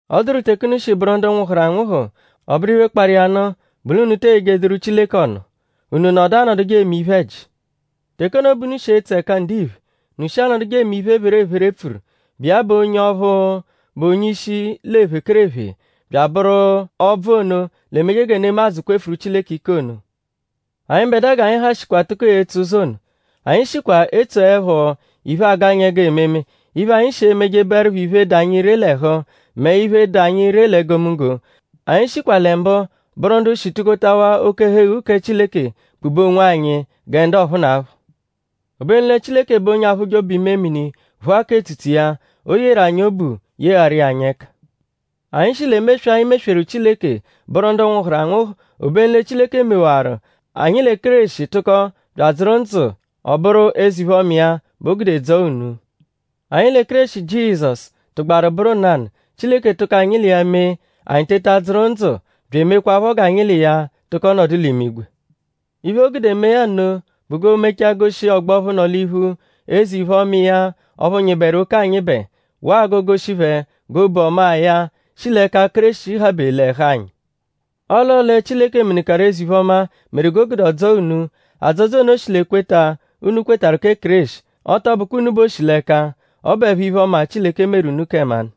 Ọ dụru teke unu shi bụru ndu nwụhuru anwụhu. Ọ bụru iphe, kparụ iya nụ bụ l'unu te eyejeduru Chileke ọnu; unu nọdu anọduje eme iphe-ẹji. Teke ono bẹ unu shi etso ẹka ndiphe. Unu shi anọduje eme iphe, epherephere pfuru, bụ iya bụ onye ọphu, bụ onye-ishi l'ephekerephe bya abụru ọbvu ono, l'emeje gẹ nemadzụ kwefuru Chileke ike ono. Anyịbedua g'anyi ha shikwa tụko etso ụzo ono. Anyi shikwa etsoẹpho iphe, agụ anyi ẹgu ememe. Iphe, anyi shi emeje bụerupho iphe, dụ anyi ree l'ẹhu; mẹ iphe, dụ anyi ree l'egomunggo. Anyi shikwa lẹ mbụ bụru ndu shi tukotawaa oke-ẹhu-eghu kẹ Chileke kpube onwanyi gẹ ndu ọphuunapho. Obenu lẹ Chileke bụ onye aphụje obu-imemini; phụa k'etsutsu iya. O yeru anyi obu yegharụ iya anyi ẹka. Anyi shi l'emeswe, anyi mesweru Chileke; bụru ndu nwụhuru anwụhu. Obenu lẹ Chileke mewaru; anyi lẹ Kéreshi tụko bya adzụru ndzụ; ọ bụru eze-iphe-ọma iya bẹ o gude dzọo unu. Anyi lẹ Kéreshi Jizọsu tụgbaru bụru nanụ; Chileke tụko anyi l'iya mee; anyi teta dzụru ndzụ bya emekwaphọ g'anyi l'iya tụko nọdu l'imigwe. Iphe, o gude mee ya nno bụ g'oo-mecha goshi ọgbo ọphu nọ l'iphu eze-iphe-ọma iya ọphu nyịberu oke anyịbe; waa g'oo-goshi phẹ g'obu ọmaa ya, shi l'ẹka Kéreshi habe l'ẹhu anyi. Ọo l'ọo lẹ Chileke menụkaru eze-iphe-ọma meru g'o gude ọ dzọo unu. Adzọdzo ono shi l'ekweta, unu kwetarụ kẹ Kéreshi; ọ tọ bụkwa unu bẹ o shi l'ẹka; ọ bụepho iphe-ọma, Chileke meru unu kẹ mmanụ;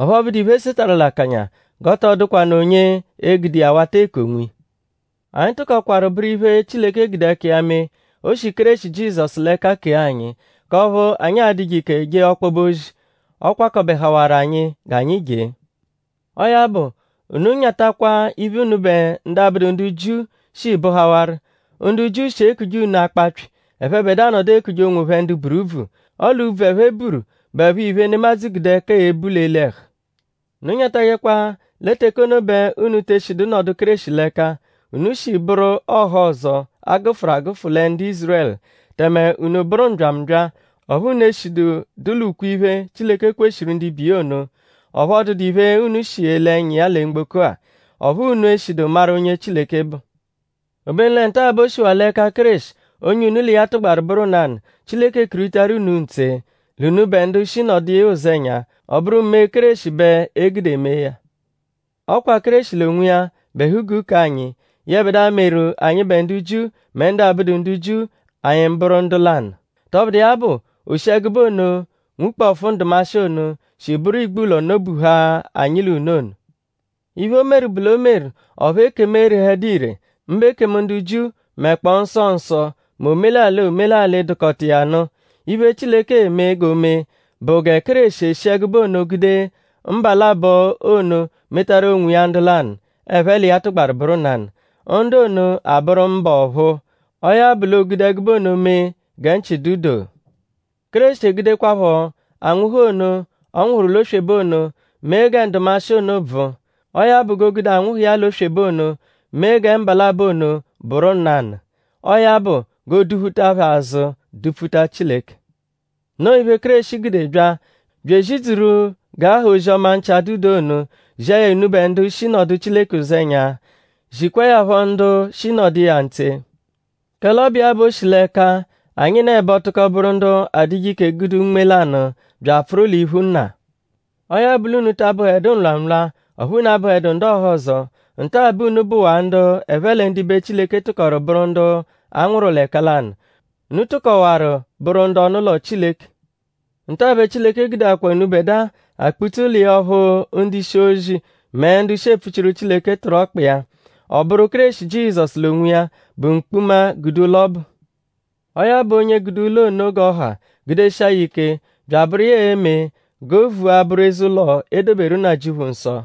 ọphu ọ bụdu iphe, e setarụ l'akanya; g'ọ tọ dụkwanu onye e-gude iya wata eku onwiya. Anyi tụkokwaru bụru iphe, Chileke gude ẹka iya mee. O shi Kéreshi Jizọsu l'ẹka kee anyi; k'ọphu anyi a-dụje ike je ọkpobe ozi, ọ kwakọbehawaru anyi g'anyi jee. Ọo ya bụ; unu nyatakwa iphe, unubẹ ndu abụdu ndu Jiu shi bụhawaru. Ndu Jiu shi ekuje unu akpapyị. Ẹphebedua nọdu ekuje onwophẹ ndu buru úbvù. Ọle úbvù, ẹphe buru bụepho iphe, nemadzụ gude ẹka ebu l'eli ẹhu. Unu nyatajẹkwa lẹ teke ono bẹ unu te eshidu nọdu Kéreshi l'ẹka; unu shi bụru ndu ọhozo, a gụfuru agụfu lẹ ndu Ízurẹlu tẹme unu bụru mbyambya, ọphu unu eshidu dụ l'ukwe-iphe, Chileke kweshiru ndibe iya ono. Ọphu ọ dụdu iphe unu shi ele ẹnya iya lẹ mgboko-a. Ọphu unu eshidu maru onye Chileke bụ. Obenu lẹ nta-a bẹ o shiwaa l'ẹka Kéreshi; onye unu l'iya tụgbaru bụru nanụ; Chileke kuritaru unu ntse; l'unubẹ ndu shi nọdu iya ụzenya; ọ bụru mee Kéreshi bẹ e gude mee ya. Ọ kwa Kéreshi l'onwiya bụ ẹhu-guu k'anyi; yẹbedua, meru anyịbe ndu Jiu mẹ ndu abụdu ndu Jiu; anyi bụru ndu lanụ. Tọbudu iya bụ; o shi ẹgube ono nwukpọfu ndụmashi ono, shi bụru igbulọ nọ-buha anyi l'unu ono. Iphe, o meru bụ l'o meru; ọphu ekemu erehẹdu ire; mbụ ekemu ndu Jiu mẹkpoo nsọ nsọ; mẹ omelalị omelalị, dụkota iya nụ. Iphe, Chileke eme g'o mee bụ gẹ Kéreshi e-shi ẹgube ono gude mba labọ ono metaru onwiya ndu lanụ, ẹphe l'iya tụgbaru bụru nanụ. Ndu ono abụru ḿbà ọ̀phúú. Ọo ya bụ l'o gude ẹgube ono mee gẹ nchị dụ doo. Kéreshi egudekwaphọ anwụhu ono, ọ nwụhuru l'oswebe ono; mee gẹ ndụmashi ono bvụ. Ọo ya bụ; g'o gude anwụhu iya l'oswebe ono; mee gẹ mba labọ ono bụru nanụ. Ọo ya bụ g'ooduphuta phẹ azụ dupfuta Chileke. Noo iphe, Kéreshi gude bya; bya ezidzuru g'a ha ozi-ọma nchị-adụ-doo ono; zia ya unubẹ ndu shi nọdu Chileke ụzenya; zikwaa ya phọ ndu shi nọdu iya ntse. Kẹle ọ bụ iya bẹ o shi l'ẹka anyịnebo tụko bụru ndu adụje ike gude Unme lanụ bya apfụru l'iphu Nna. Ọo ya bụ; l'unu ta abụhedu nlwamụlwa; ọphu unu abụhedu ndu ọhozo. Nta bẹ unu bụwaa ndu ẹphe lẹ ndibe Chileke tụkoru bụru ndu a nwụru l'ẹka lanụ; unu tụkowaru bụru ndu ọnu-ụlo Chileke. Nta-a bẹ Chileke gudeakwa unubẹdua akpụ-tse ụlo iya ọphu ndu-ishi-ozi mẹ ndu shi epfuchiru Chileke tụru ọkpa iya. Ọ bụru Kéreshi Jizọsu l'onwiya bụ mkpuma, gude ụlo ọbu. Ọo ya bụ onye gude ụlo ono g'ọ ha gudeshia ya ike bya abụru iya e-me g'o vua bụru eze-ụlo, e doberu Nnajịuphu nsọ.